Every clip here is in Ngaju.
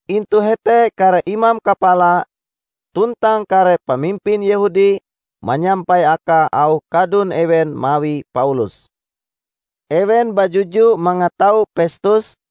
Intu hete kare imam kapala tuntang kare pamimpin Yehudi manyampai akae auh kadun ewen mawi Paulus. Ewen bajuju mangatau Pestus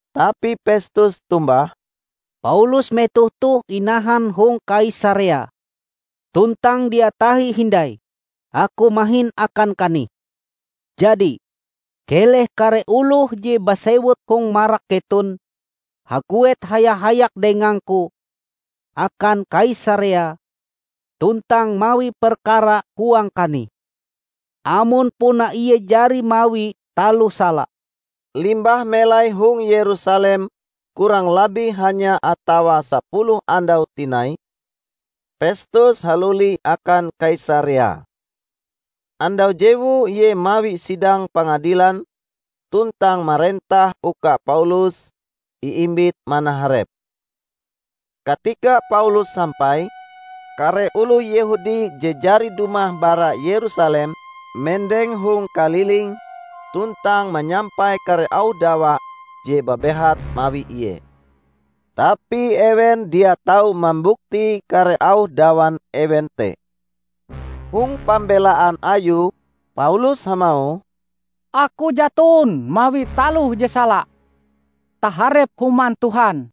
Tapi Pestus tombah, "Paulus metoh toh inahan hong Kaisarea; tuntang dia tahi hindai aku mahin akan kanih. Jadi, keleh kare oloh je basewut hong marak keton haguet haya-hayak dengangku akan Kaisarea tuntang mawi perkara huang kanih, amon puna ie jari mawi taloh sala." Limbah melai hong Yerusalem kurang labih hanya atawa sapuluh andau tinai Pestus haluli akan Kaisarea. Andau jewue ie mawi sidang pangadilan tuntang marentah uka Paulus iimbit manaharep. Katika Paulus sampai, kare oloh Yehudi je jari dumah bara Yerusalem mendeng hong kalilinge tuntang manyampai kare auh dawa je babehat mawi ie. Tapi ewen dia tau mambukti kare auh dawan ewen te. Hong pambelaan ayue Paulus hamauh, "Aku jaton mawi taloh je sala taharep Human Tuhan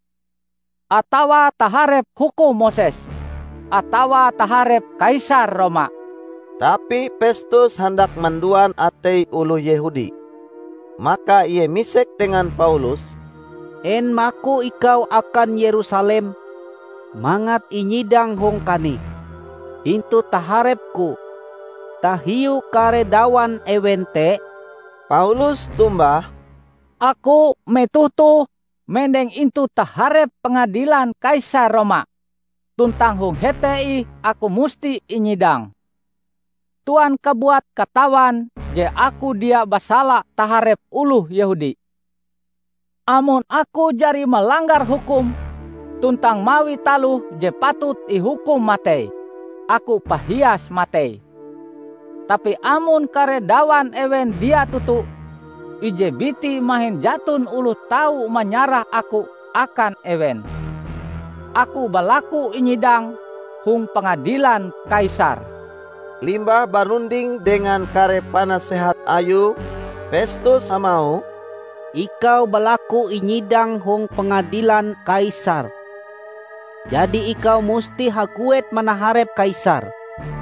atawa taharep hukum Moses atawa taharep Kaisar Roma." Tapi Pestus handak manduan atei oloh Yehudi. Maka ie misek dengan Paulus, "En maku ikau akan Yerusalem mangat inyidang hong kanih intu taharepku tahiu kare dawan ewen te?" Paulus tombah, "Aku metoh toh mendeng intu taharep pangadilan Kaisar Roma; tuntang hong hete ih aku musti inyidang. Tuan kabuat katawan je aku dia basala taharep oloh Yehudi. Amon aku jari malanggar hukum tuntang mawi taloh je patut ihukum matei, aku pahias matei. Tapi amon kare dawan ewen dia toto, ije biti mahin jaton oloh tau manyarah aku akan ewen. Aku balaku inyidang hong pangadilan Kaisar!" Limbah barunding dengan kare panasehat ayue, Pestus hamauh, "Ikau balaku inyidang hong pangadilan Kaisar, jadi ikau musti haguet manaharep Kaisar."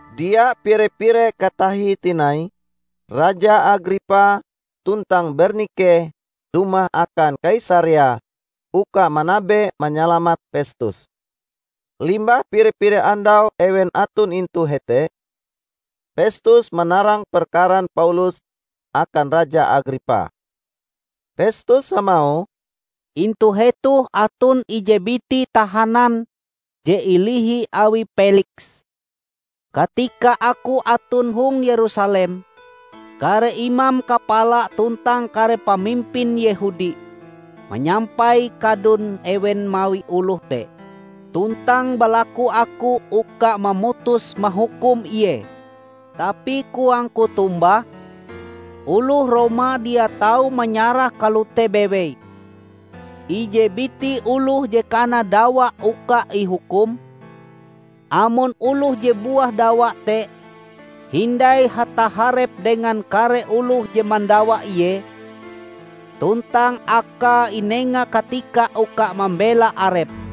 Dia pire-pire katahie tinai, Raja Agripa tuntang Bernike dumah akan Kaisarea uka manabe manyalamat Pestus. Limbah pire-pire andau ewen aton intu hete, Pestus manarang perkaran Paulus akan Raja Agripa. Pestus hamauh, "Intu hetoh aton ije biti tahanan je ilihi awi Peliks. Katika aku aton hong Yerusalem, kare imam kapala tuntang kare pamimpin Yehudi manyampai kadun ewen mawi oloh te tuntang balaku aku uka mamutus mahukum ie. Tapi koangku tombah, oloh Roma dia tau manyarah kalote bewei ije biti oloh je kana dawa uka ihukum, amon oloh je buah dawa te hindai hataharep dengan kare oloh je mandawa ie, tuntang akae inenga katika uka mambela arepe.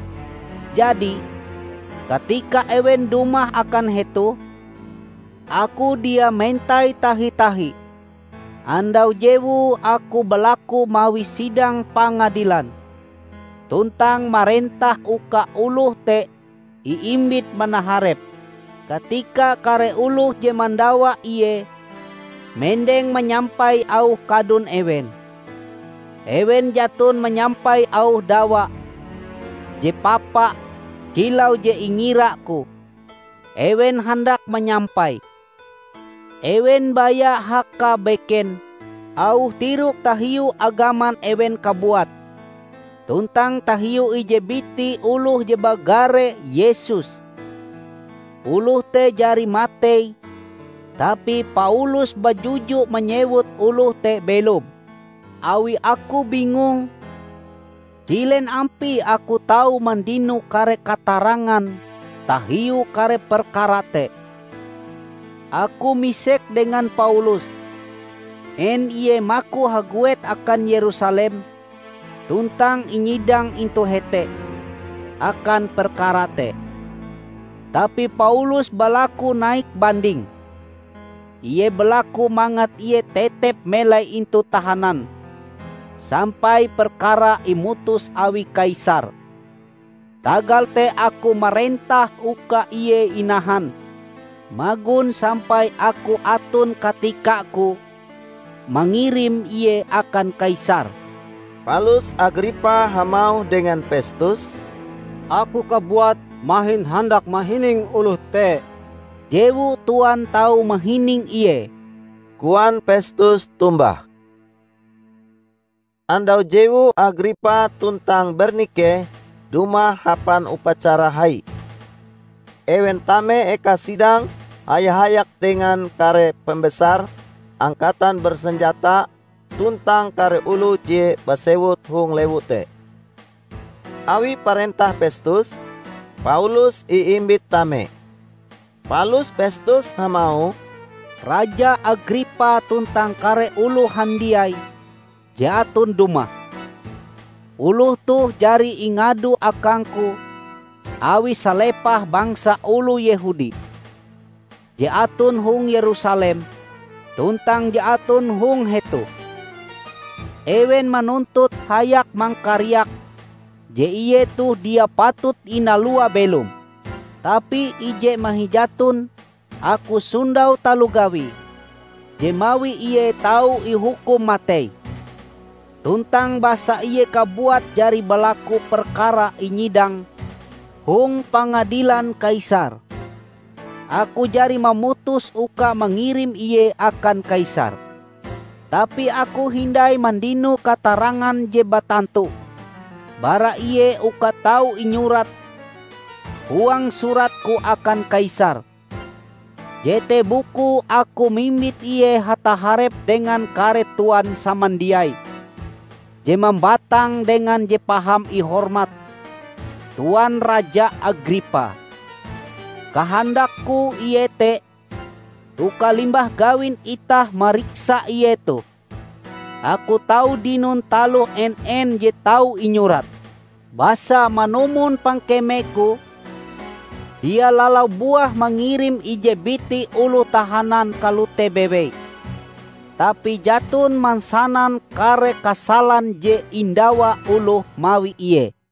Jadi, katika ewen dumah akan hetoh, aku dia mentai tahi-tahi. Andau jewue aku balalu mawi sidang pangadilan tuntang marentah uka oloh te iimbit manaharep. Katika kare oloh je mandawa ie mendeng mayampai auh kadun ewen, ewen jaton manyampai auh dawa je papa kilau je ingiraku ewen handak manyampaie. Ewen baya hakabeken auh tiroke tahiu agaman ewen kabuat tuntang tahiu ije biti oloh je bagare Yesus. Oloh te jari matei tapi Paulus bajuju manyewut oloh te belom. Awi aku bingung kilen ampie aku tau mandino kare katarangan tahiu kare perkara te, aku misek dengan Paulus en ie maku haguet akan Yerusalem tuntang inyidang intu hete akan perkara te. Tapi Paulus balaku naik banding; ie balaku mangat ie tetep melai intu tahanan sampai perkarae imutus awi Kaisar. Tagal te aku marentah uka ie inahan magon sampai aku aton katikaku mangirim ie akan Kaisar." Palus Agripa hamauh dengan Pestus, "Aku kabuat mahin handak mahining oloh te." "Jewu Tuan tau mahining ie," koan Pestus tombah. Andau jewue Agripa tuntang Bernike dumah hapan upacara hai. Ewen tame eka sidang haya-hayak dengan kare pembesar angkatan bersenjata tuntang kare oloh je basewut hong lewu te. Awi parentah Pestus, Paulus iimbit tame. Palus Pestus hamauh, "Raja Agripa tuntang kare oloh handiai je aton dumah! Oloh toh jari ingadu akangku awi salepah bangsa oloh Yehudi, je aton hong Yerusalem tuntang je aton hong hetoh. Ewen manuntut hayak mangkariak je ie toh dia patut inalua belom. Tapi ije mahin jaton aku sondau taloh gawie je mawi ie tau ihukum matei. Tuntang basa ie kabuat jari balaku perkarae inyidang hong pangadilan Kaisar, aku jari mamutus uka mangirim ie akan Kaisar. Tapi aku hindai mandino katarangan je batantu bara ie uka tau inyurat huang suratku akan Kaisar. Jete bukue aku mimbit ie hataharep dengan kare Tuan samandiai je mambatang dengan Je Paham Ihormat Tuan Raja Agripa! Kahandakku iete uka limbah gawin itah mariksa ie toh, aku tau dinon taloh en-en je tau inyurat. Basa manumon pangkemeku, dia lalau buah mangirim ije biti oloh tahanan kalote bewei tapi jaton mansanan kare kasalan je indawa oloh mawi ie."